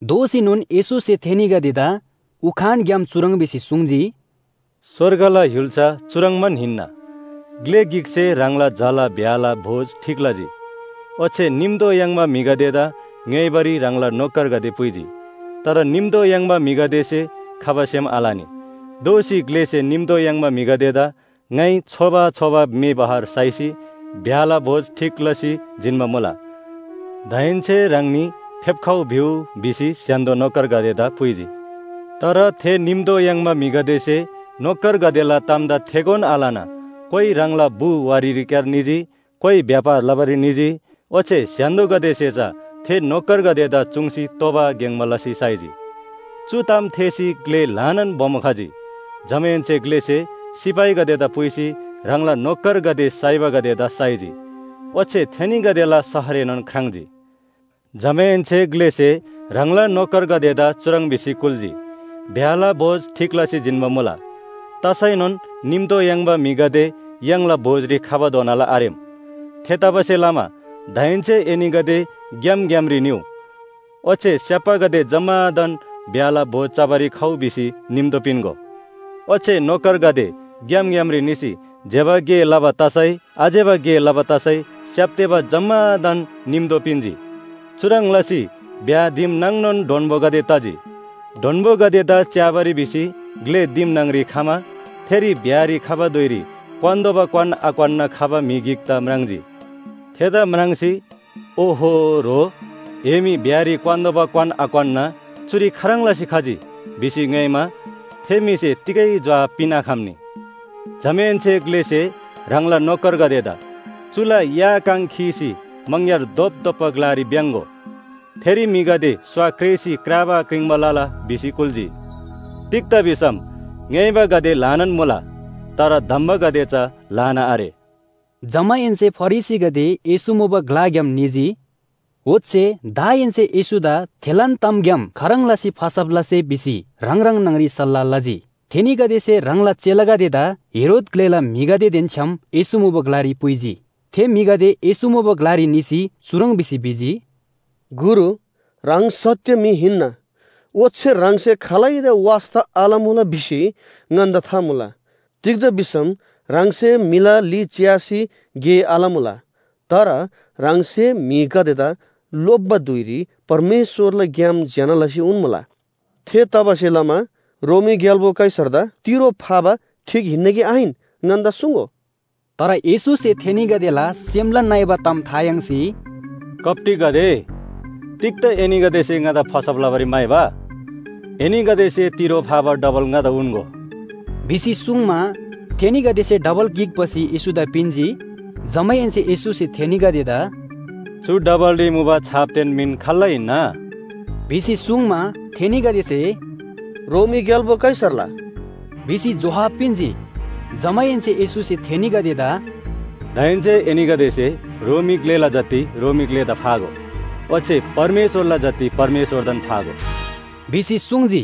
दोःसीनोन येशूसे थेनीगदेदा उखानग्‍याम चुह्रङ् भिसी सुङ्जी, “स्‍वर्गला य्‍हुल्‍सा चुह्रङ्बान हिन्‍ना, ग्‍ले गिकसे ह्राङला झाला ब्‍याहला भोज ठीक लजी। ओच्‍छे निम्‍तो याङ्बा म्‍हिगदेदा ङ्‌योइबारी ह्राङला नोकरगदे पुइजी। तर निम्‍तो याङ्बा म्‍हिगदेसे खबा सेम आलनी। “दोःसी ग्‍लेसे निम्‍तो याङ्बा म्‍हिगदेदा ‘ङाइ छोबा छोबा म्‍हे बहर साइसी ब्‍याहला भोज ठीक लसी जिन्‍बा मुला। दाहेन्‍से ह्राङनी फेप्‍खउ भिउ’ भिसी स्‍य्‍हान्‍दो नोकरगदेदा पुइजी। “तर थे निम्‍तो याङ्बा म्‍हिगदेसे नोकरगदेला तामदा थेगोन आलना कोइ ह्राङला बु वारीरीक्‍यार निजी, कोइ व्‍यापार लबारी निजी, ओच्‍छे स्‍य्‍हान्‍दोगदेसे चा थे नोकरगदेदा चुङ्सी तोबा ग्‍याङ्‍बा लसी साइजी। चु ताम थेःसी ग्‍ले ल्‍हानान बोमो खजी। जमाहेन्‍से ग्‍लेसे सिपाहीगदेदा पुइसी ह्राङला नोकरगदे साइबागदेदा साइजी। ओच्‍छे थेनीगदेला शहरएनोन ख्राङ्‌जी। “जमाहेन्‍से ग्‍लेसे ह्राङला नोकरगदेदा चुह्रङ् भिसी कुल्‍जी, ‘ब्‍याहला भोज ठीक लसी जिन्‍बा मुला। तसैनोन निम्‍तो याङ्बा म्‍हिगदे य्‍हाङला भोजरी खबाधोनाला आरेम। थेतबासेलमा दाहेन्‍से एनीगदे ग्‍याम ग्‍यामरी निउ। ओच्‍छे स्‍याप्‍बागदे जम्‍मादान ब्‍याहला भोज चबारी खउ भिसी निम्‍तो पिन्‍गो।’ ओच्‍छे नोकरगदे ग्‍याम ग्‍यामरी निसी ज्‍यबा गे लबा तसै आज्‍यबा गे लबा तसै स्‍याप्‍तेबा जम्‍मादान निम्‍तो पिन्‍जी। चुह्रङ् लसी ब्‍याह दिम नाङनोन डोन्‍बोगदे तजी। “डोन्‍बोगदेदा च्‍याबारी भिसी ग्‍ले दिम न्‍हङ‍री खमा थेरी ब्‍याहरी खबा धुइरी क्‍वान्‍तोःबा क्‍वान आक्‍वान्‍ना खबा म्‍हि गिकदा म्राङ्जी। थेदा म्राङ्सी, ‘ओहो, ह्रो!, ए मी ब्‍याहरी क्‍वान्‍तोःबा क्‍वान आक्‍वान्‍ना चुरी खाह्रङ् लसी खजी?’ भिसी ङ्‌योइमा, थे म्‍हिसे तिगै जोहाब पिन्‍आखम्‍नी। जमाहेन्‍से ग्‍लेसे ह्राङला नोकरगदेदा ‘चुला या काङ खीसी मङग्‍यार धोपधोप्‍बा ग्‍लारी भ्‍याङ्‍गो। थेरी म्‍हिगदे स्‍वा क्रेसी क्राबा क्रिङ्बा लला’ भिसी कुल्‍जी। “तिग्‍दा भिसम ङ्‌योइबागदे ल्‍हानान मुला, तर धम्‍बागदे चा ल्‍हाना आरे।” जमाहेन्‍से फरिसीगदे येशू मुबा ग्‍लाग्‍याम निजी। ओच्‍छे दाहेन्‍से येशूदा थेलान तामग्‍याम खाह्रङ् लसी फसब लसे भिसी ह्राङ ह्राङ न्‍हङ‍री सल्‍लाह लजी। थेनीगदेसे ह्राङला चेलागदेदा हेरोद ग्‍लेला म्‍हिगदेदेन छ्‌याम येशू मुबा ग्‍लारी पुइजी। थे म्‍हिगदे येशू मुबा ग्‍लारी निसी चुह्रङ् भिसी भिजी, “गुरु, ह्राङ सत्‍य म्‍हि हिन्‍ना, ओच्‍छे ह्राङसे खालैदा वास्‍ता आलमुला भिसी ङन्‍दा था मुला। तिग्‍दा भिसम ह्राङसे म्‍हिला ली च्‍यासी गे आलमुला, तर ह्राङसे म्‍हिगदेदा लोप्‍बा धुइरी परमेश्‍वरला ग्‍याम ज्‍यना लसी उन्‍मुला। थेतबासेलमा रोमी ग्‍याल्‍बो कैसरदा तिरो फाबा ठीक हिन्‍ना कि आहिन? ङन्‍दा सुङ्‍गो।” तर येशूसे थेनीगदेला सेमला नइबा ताम था याङ्सी “कप्‍टीगदे, तिग्‍दा एनीगदेसे ङादा फसब लबारी म्‍हाइबा? एनीगदेसे तिरो फाबा डबल ङादा उन्‍गो” भिसी सुङ्मा, थेनीगदेसे डबल गिक भसी येशूदा पिन्‍जी। जमाहेन्‍से येशूसे थेनीगदेदा “चु डबलरी मुबा छापदेन मिन खाल्‍ला हिन्‍ना?” भिसी सुङ्मा, थेनीगदेसे “रोमी ग्‍याल्‍बो कैसरला” भिसी जोहाब पिन्‍जी। जमाहेन्‍से येशूसे थेनीगदेदा “दाहेन्‍से एनीगदेसे रोमी ग्‍लेला जति रोमी ग्‍लेदा फागो। ओच्‍छे परमेश्‍वरला जति परमेश्‍वरदान फागो” भिसी सुङ्जी।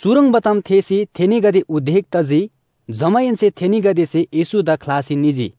चुह्रङ्बा ताम थेःसी थेनीगदे उदेक तजी। जमाहेन्‍से थेनीगदेसे येशूदा ख्‍लासी निजी।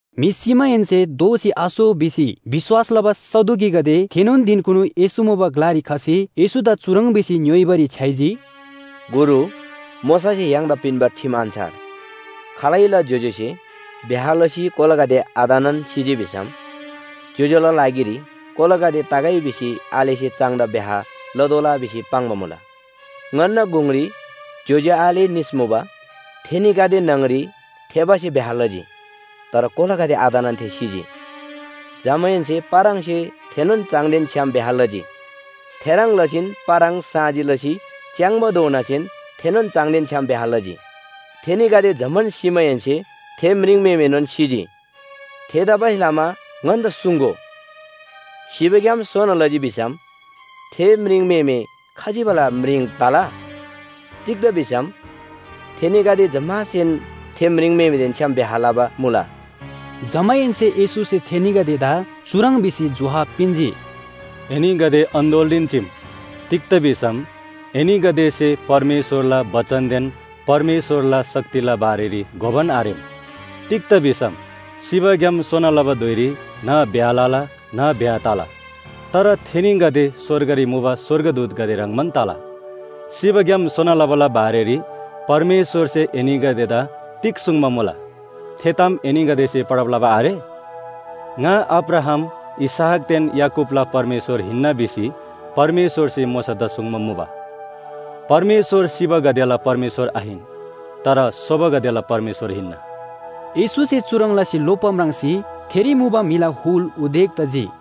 म्‍हि सिमाहेन्‍से दोःसी आसो भिसी विश्‍वास लबा सदुकीगदे थेनोन धिनकुनु येशू मुबा ग्‍लारी खसी येशूदा चुह्रङ् भिसी ङ्‌योइबारी छ्‌याइजी। “गुरु, मोशासे य्‍हाङदा पिन्‍बा ठिम अन्‍छार खालैला ज्‍योज्‍योसे ब्‍याह लसी कोलागदे आतनान सिजी भिसम ज्‍योज्‍यो‍ला लागिरी कोलागदे तगै भिसी आलेसे चाङदा ब्‍याह लतोःला भिसी पाङ्बा मुला। ङन्‍ना गुङरी ज्‍योज्‍यो आले निस मुबा। थेनीगदे न्‍हङ‍री थेबासे ब्‍याह लजी। तर कोलागदे आतनान थे सिजी। जमाहेन्‍से पाराङसे थेनोन चाङदेन छ्‌याम ब्‍याह लजी। थेह्रङ् लसीन पाराङ साँजी लसी च्‍याङ्बाधोनासेन थेनोन चाङदेन छ्‌याम ब्‍याह लजी। थेनीगदे जम्‍मान सिमाहेन्‍से थे म्रिङम्‍हेमेनोन सिजी। थेतबासेलमा ङन्‍दा सुङ्‍गो, सिबाग्‍याम सोना लजी भिसम थे म्रिङम्‍हेमे खजिबाला म्रिङ तला? तिग्‍दा भिसम थेनीगदे जम्‍मासेन थे म्रिङम्‍हेमेदेन छ्‌याम ब्‍याह लबा मुला।” जमाहेन्‍से येशूसे थेनीगदेदा चुह्रङ् भिसी जोहाब पिन्‍जी, “एनीगदे अन्‍दोलरीन चीम, तिग्‍दा भिसम एनीगदेसे परमेश्‍वरला बचनदेन परमेश्‍वरला शक्तिला बारेरी घोबान आरेम। तिग्‍दा भिसम सिबाग्‍याम सोना लबा धुइरी न्‍ह ब्‍याह लला न्‍ह ब्‍याह तला। तर थेनीगदे स्‍वर्गरी मुबा स्‍वर्गदूतगदे ह्रङ्‌बान तला। सिबाग्‍याम सोना लबाला बारेरी परमेश्‍वरसे एनीगदेदा तिग सुङ्बा मुला, थे ताम एनीगदेसे पढब लबा आरे? ‘ङा अब्राहाम, इसहाकदेन याकूबला परमेश्‍वर हिन्‍ना’ भिसी परमेश्‍वरसे मोशादा सुङ्बा मुबा। परमेश्‍वर सिबागदेला परमेश्‍वर आहिन, तर सोबागदेला परमेश्‍वर हिन्‍ना।” येशूसे चुह्रङ् लसी लोप्‍बा म्राङ्सी थेरी मुबा म्‍हिला हुल उदेक तजी।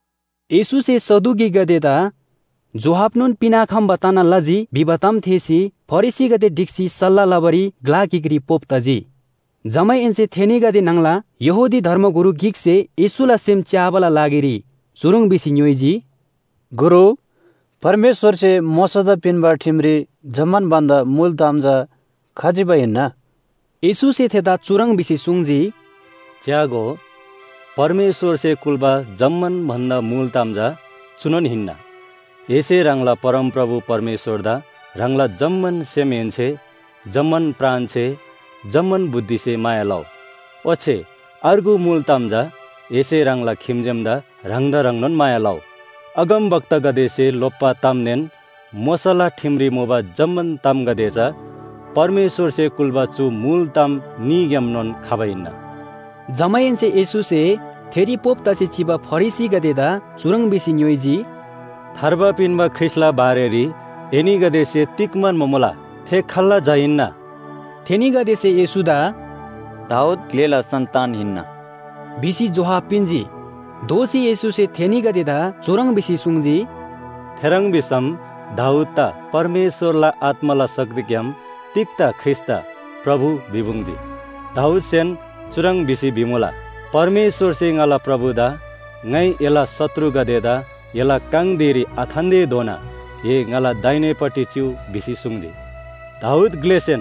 येशूसे सदुकीगदेदा जोहाबनोन पिन्‍आखम्‍बा तना लजी भिबा ताम थेःसी फरिसीगदे ढिक्‍सी सल्‍लाह लबारी ग्‍ला गिकरी पोप तजी। जमाहेन्‍से थेनीगदे न्‍हङला यहूदी धर्मगुरु गिकसे येशूला सेम च्‍याबाला लागिरी चुह्रङ् भिसी ङ्‌योइजी, “गुरु, परमेश्‍वरसे मोशादा पिन्‍बा ठिमरी जम्‍मान भन्‍दा मुल ताम चा खजिबा हिन्‍ना?” येशूसे थेदा चुह्रङ् भिसी सुङ्जी, “च्‍यागो, परमेश्‍वरसे कुल्‍बा जम्‍मान भन्‍दा मुल ताम चा चुनोन हिन्‍ना। एसे ह्राङला परमप्रभु परमेश्‍वरदा ह्राङला जम्‍मान सेमहेन्‍से, जम्‍मान प्राणसे, जम्‍मान बुद्धिसे माया लउ। ओच्‍छे अर्गु मुल ताम चा एसे ह्राङला खिम्‍जेमदा ह्राङदा ह्रङ्नोन माया लउ। अगमवक्तागदेसे लोप्‍बा तामदेन मोशाला ठिमरी मुबा जम्‍मान तामगदे चा परमेश्‍वरसे कुल्‍बा चु मुल ताम न्‍हीग्‍यामनोन खबा हिन्‍ना।” जमाहेन्‍से येशूसे थेरी पोप तसी चिबा फरिसीगदेदा चुह्रङ् भिसी ङ्‌योइजी, “थार्बा पिन्‍बा ख्रीष्‍टला बारेरी एनीगदेसे तिग म्‍हन्‍बा मुला? थे खाल्‍ला झा हिन्‍ना?” थेनीगदेसे येशूदा “दाऊद ग्‍लेला सन्‍तान हिन्‍ना” भिसी जोहाब पिन्‍जी। दोःसी येशूसे थेनीगदेदा चुह्रङ् भिसी सुङ्जी, “थेह्रङ् भिसम दाऊददा परमेश्‍वरला आत्‍माला शक्तिग्‍याम तिग्‍दा ख्रीष्‍टदा ‘प्रभु’ भिपुङ्जी? दाऊदसेन चुह्रङ् भिसी भिमुला, ‘परमप्रभुसे ङाला प्रभुदा, “ङाइ एला शत्रुगदेदा एला काङ धिरी आथान्‍तेधोना ए ङाला दाहिनेपट्टि चिउ भिसी सुङ्जी।”’ दाऊद ग्‍लेसेन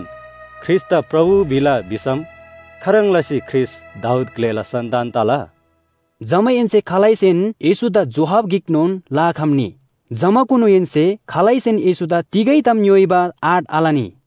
ख्रीष्‍टदा प्रभु भिला भिसम खाह्रङ् लसी ख्रीष्‍ट दाऊद ग्‍लेला सन्‍तान तला?” जमाहेन्‍से खालैसेन येशूदा जोहाब गिकनोन लआखम्‍नी। जमाकुनुहेन्‍से खालैसेन येशूदा तिगै ताम ङ्‌योइबा आँट आलनी।